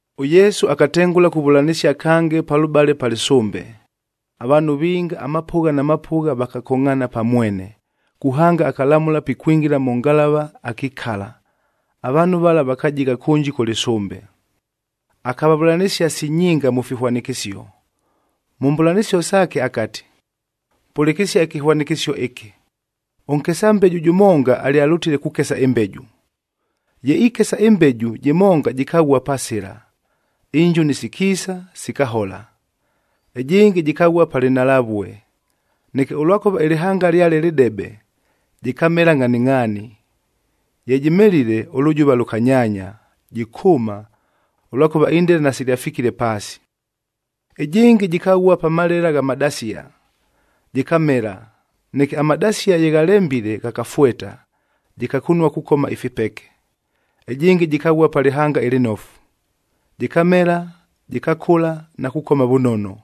ɄYesu akatengʉla kuvʉlanɨsia kange palʉbale pa lɨsʉmbe. Avaanhu vinga amapʉgha na mapʉgha vakakongʼhaana pa mwene, kuhanga akalamʉla pikwingila mʉ ngalava akikala, avaanhu vala vakajigha kʉnji kʉ lɨsʉmbe. Akavavʉlanɨsia si nyinga mʉ fihwanɨkɨsio. Mʉ mbʉlanɨsio saake akati, “Pʉlɨkɨsia ɨkɨhwanɨkɨsio ɨkɨ! Ʉnkesa mbeju jʉmonga alyalʉtile kukesa ɨmbeju. Ye ikesa ɨmbeju, jɨmonga jɨkaghua pa sɨla, injuni sikiisa, sikahola. Ɨjɨngɨ jɨkaghua pa lɨnhalavue, neke ʉlwakʉva ɨlɨhanga lyale lɨdebe, jɨkamela ngʼhaningʼhaani. Ye jɨmelile, ʉlʉjʉva lʉkanyaanya, jɨkʉʉma, ʉlwakʉva indela nasilyafikile paasi. Ɨjɨngɨ jɨkaghua pa malela gha madasia, jɨkamela, neke amadasia ye ghalembile ghakafweta, jɨkakunua kukoma ifipeke. Ɨjɨngɨ jɨkaghua pa lɨhanga ɨlɨnofu, jɨkamela, jɨkakʉla na kukoma vʉnono,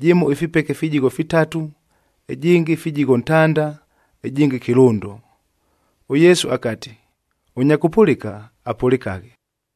jɨmo ifipeke fijigho fitatu, ɨjɨngɨ fijigho ntanda, ɨjɨngɨ kɨlʉndo.” ɄYesu akati, “Ʉnya kʉpʉlɨka, apʉlɨkaghe.”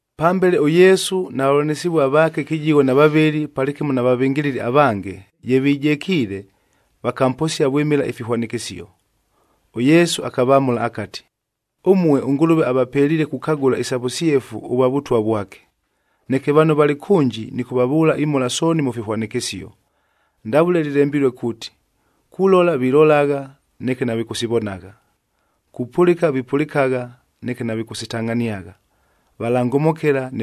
Pambele ʉYesu na vavʉlanɨsɨvua vaake kɨjigho na vavɨlɨ palɨkɨmo na vavɨngɨlɨli avange, ye vijekiile, vakamposia vwɨmɨla ifihwanɨkɨsio. ɄYesu akavamʉla akati, “Ʉmue ʉNgʉlʉve avapeliile kukagʉla isa vʉsyefu ʉvwa Vʉtwa vwake. Neke vano valɨ kʉnji nɨkʉvavʉʉla imhola sooni mʉ fihwanɨkɨsio, ndavʉle lɨlembilue kuuti, ‘Kulola vilolagha, neke navikʉsivonagha. Kupʉlɨka vipʉlɨkagha, neke navikʉsitangʼhaniagha, valangomokela,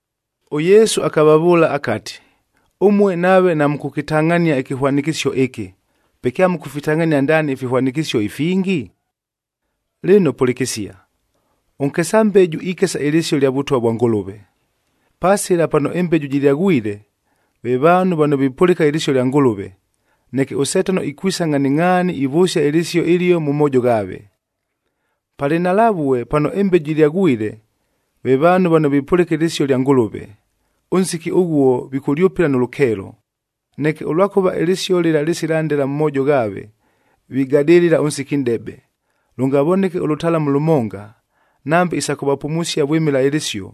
ɄYesu akavavʉʉla akati, “Ʉmue nave namʉkʉkɨtangʼhania ɨkɨhwanɨkɨsio ɨkɨ, pe kyamʉkʉfitangʼhania ndaani ifihwanɨkɨsio ifingi? Lɨno pʉlɨkɨsia, ʉnkesa mbeju ikesa ɨlɨsio lya Vʉtwa vwa Ngʉlʉve. Pa sɨla pano ɨmbeju jɨlyaghwile, ve vaanhu vano vipʉlɨka ɨlɨsio lya Ngʉlʉve, neke ʉSetano ikwisa ngʼhaningʼhaani ivʉsia ɨlɨsio ɨlio mʉ moojo ghaave. Pa lɨnhalavue pano ɨmbeju jɨlyaghwile, ve vaanhu vano vipʉlɨka ɨlɨsio lya Ngʉlʉve, ʉnsiki ʉghuo vikʉlyʉpɨla nʉ lʉkeelo. Neke ʉlwakʉva ɨlɨsio lɨla lɨsila ndela mʉ mwojo ghaave, vigadɨlɨla ʉnsiki nʼdebe, lʉngavoneke ʉlʉtalamu lʉmonga, nambe isa kʉvapumusia vwɨmɨla ɨlɨsio,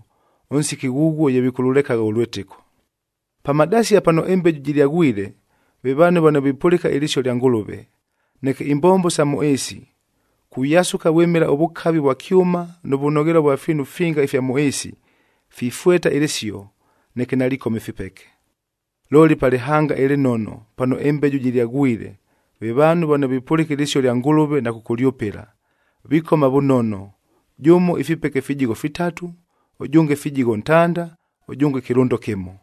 ʉnsiki ghʉghuo ye vikʉlʉlekagha ʉlwɨtɨko. Pa madasia pano ɨmbeju jɨlyaghwile, ve vaanhu vano vipʉlɨka ɨlɨsio lya Ngʉlʉve, neke imbombo sa mʉ ɨɨsi, kuyasʉka vwɨmɨla ʉvʉkavi vwa kyʉma nʉ vʉnoghelua vwa fiinu finga ifya mʉ ɨɨsi, fifweta ɨlɨsio, neke nalikoma ifipeke. Looli, pa lɨhanga ɨlɨnono pano ɨmbeju jɨlyaghwile, ve vaanhu vano vipʉlɨka ɨlɨsio lya Ngʉlʉve na kʉkʉlyʉpɨla, vikoma vʉnono, jʉmo ifipeke fijigho fitatu, ʉjʉnge fijigho ntanda, ʉjʉnge kɨlʉndo kɨmo.”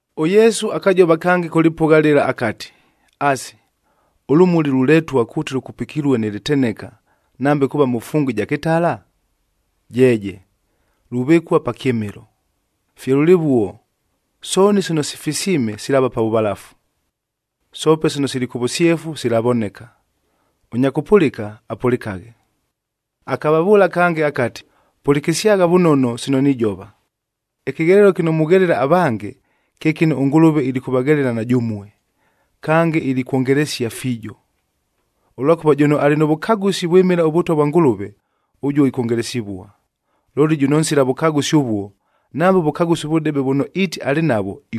ɄYesu akajova kange kʉ lɨpʉgha lɨla akati, “Asi, ʉlʉmuli luletua kuuti lʉkupikilue nɨ lɨteneka, nambe kuuva mʉ fungu ɨja kɨtala? Jeeje! Luvɨkua pa kyɨmɨlo. Fye lʉlɨvuo, sooni sino sifisiime silaava pa vʉvalafu, soope sino sili kʉ vʉsyefu silavoneka. Ʉnya kʉpʉlɨka, apʉlɨkaghe!” Akavavʉʉla kange akati, “Pʉlɨkɨsyagha vʉnono sino nijova! Ɨkɨghelelo kɨno mughelela avange, kye kɨno ʉNgʉlʉve ilikʉvaghelela na jʉmue, kange ilikwongelesia fiijo. Ʉlwakʉva jʉno alɨ nʉ vʉkagʉsi vwɨmɨla ʉVʉtwa vwa Ngʉlʉve, ʉjuo ikwongelesivua. Looli jʉno nsila vʉkagʉsi ʉvuo, nambe ʉvʉkagʉsi ʉvʉdebe vʉno iiti alɨ navwo,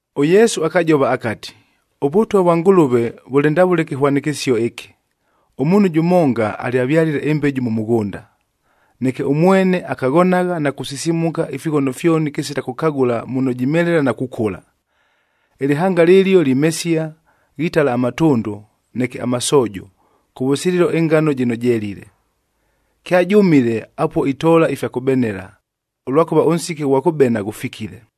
ɄYesu akajova akati, “ɄVʉtwa vwa Ngʉlʉve vʉlɨ ndavʉle ɨkɨhwanɨkɨsio ɨkɨ: Ʉmuunhu jʉmonga alyavyalile ɨmbeju mʉ mʉghʉnda. Neke ʉmwene akaghonagha na kusisimuka ifighono fyoni kɨsila kʉkagʉla muno jimelela na kukʉla. Ɨlɨhanga lɨlio limesia, ghitala amatʉndʉ, neke amasoojo, kʉvʉsililo ɨngano jɨno jelile. Kyajʉmile, apuo itoola ifya kʉbenela, ʉlwakʉva ʉnsiki ʉghwa kʉbena ghʉfikile.”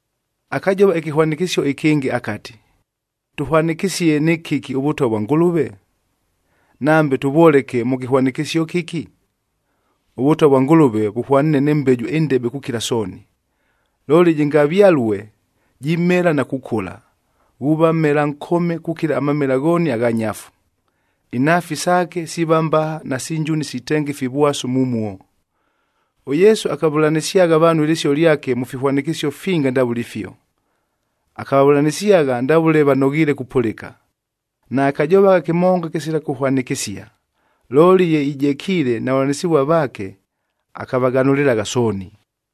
Akajova ɨkɨhwanɨkɨsio ɨkɨngɨ akati, “Tʉhwanɨkɨsie nɨ kɨki ʉVʉtwa vwa Ngʉlʉve? Nambe tʉvwoleke mʉ kɨhwanɨkɨsio kɨki? ɄVʉtwa vwa Ngʉlʉve vʉhwaniine nɨ mbeju ɨndebe kukila sooni,c looli jɨngavyalue, jimela na kukʉla, ghuuva mmela nkome kukila amamela ghooni agha nyafu. Inhaafi saake siiva mbaha nasi njuni sitenga ifivwasu mumuo.” ɄYesu akavʉlanɨsyagha vaanhu ɨlɨsio lyake mʉ fihwanɨkɨsio finga ndavʉle ifio. Akavavʉlanɨsyagha ndavʉle vanoghiile kupʉlɨka. Naakajovagha kɨmonga kɨsila kʉhwanɨkɨsia, looli ye ijekiile na vavʉlanɨsɨvua vaake, akavaghanʉlɨlagha sooni.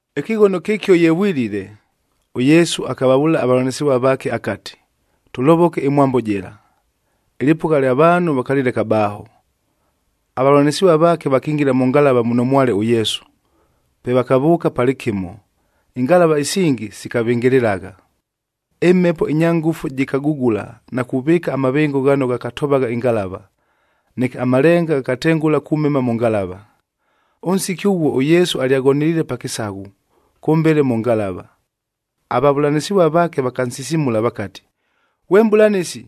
Ɨkɨghono kɨkio ye vwilile, ʉYesu akavavʉʉla avavʉlanɨsɨvua vaake akati, “Tʉlovoke ɨmwambo jɨla.” Ɨlɨpʉgha lya vaanhu vakalɨleka baaho, avavʉlanɨsɨvua vaake vakingila mʉ ngalava muno mwale ʉYesu, pe vakavʉʉka palɨkɨmo, ingalava isingi sikavɨngɨlɨlagha. Ɨmhepo ɨnya ngʉfu jɨkagugula na kuvɨɨka amavɨngo ghano ghakatovagha ɨngalava, neke amalenga ghakatengʉla kumema mʉ ngalava. Ʉnsiki ʉghuo ʉYesu alyaghoneliile pa kɨsaghu kʉmbele mʉ ngalava. Avavʉlanɨsɨvua vaake vakansisimula vakati, “Ghwe Mʼbʉlanɨsi,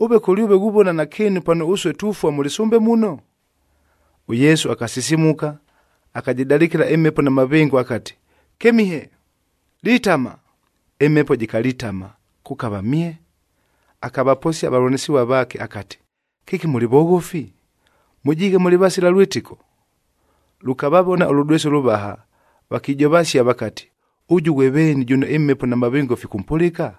ʉve kʉlyʉve ghuvona nakɨɨnu pano ʉsue tufua mʉ lɨsʉmbe muno?” ɄYesu akasisimuka akajɨdalɨkɨla ɨmhepo na mavɨngo akati, “Kɨmihe! Litama!” Ɨmhepo jɨkalitama, kʉkava mye. Akavaposia avavʉlanɨsɨvua vaake akati, “Kɨki mʉlɨ voghofi? Mʉjiighe mʉlɨ vasila lwɨtɨko?” Lʉkavavona ʉlʉdwesi ʉlʉvaha, vakijovasia vakati, “Ʉjʉ ghwe veeni, jʉno ɨmhepo na mavɨngo fikʉmpʉlɨka?”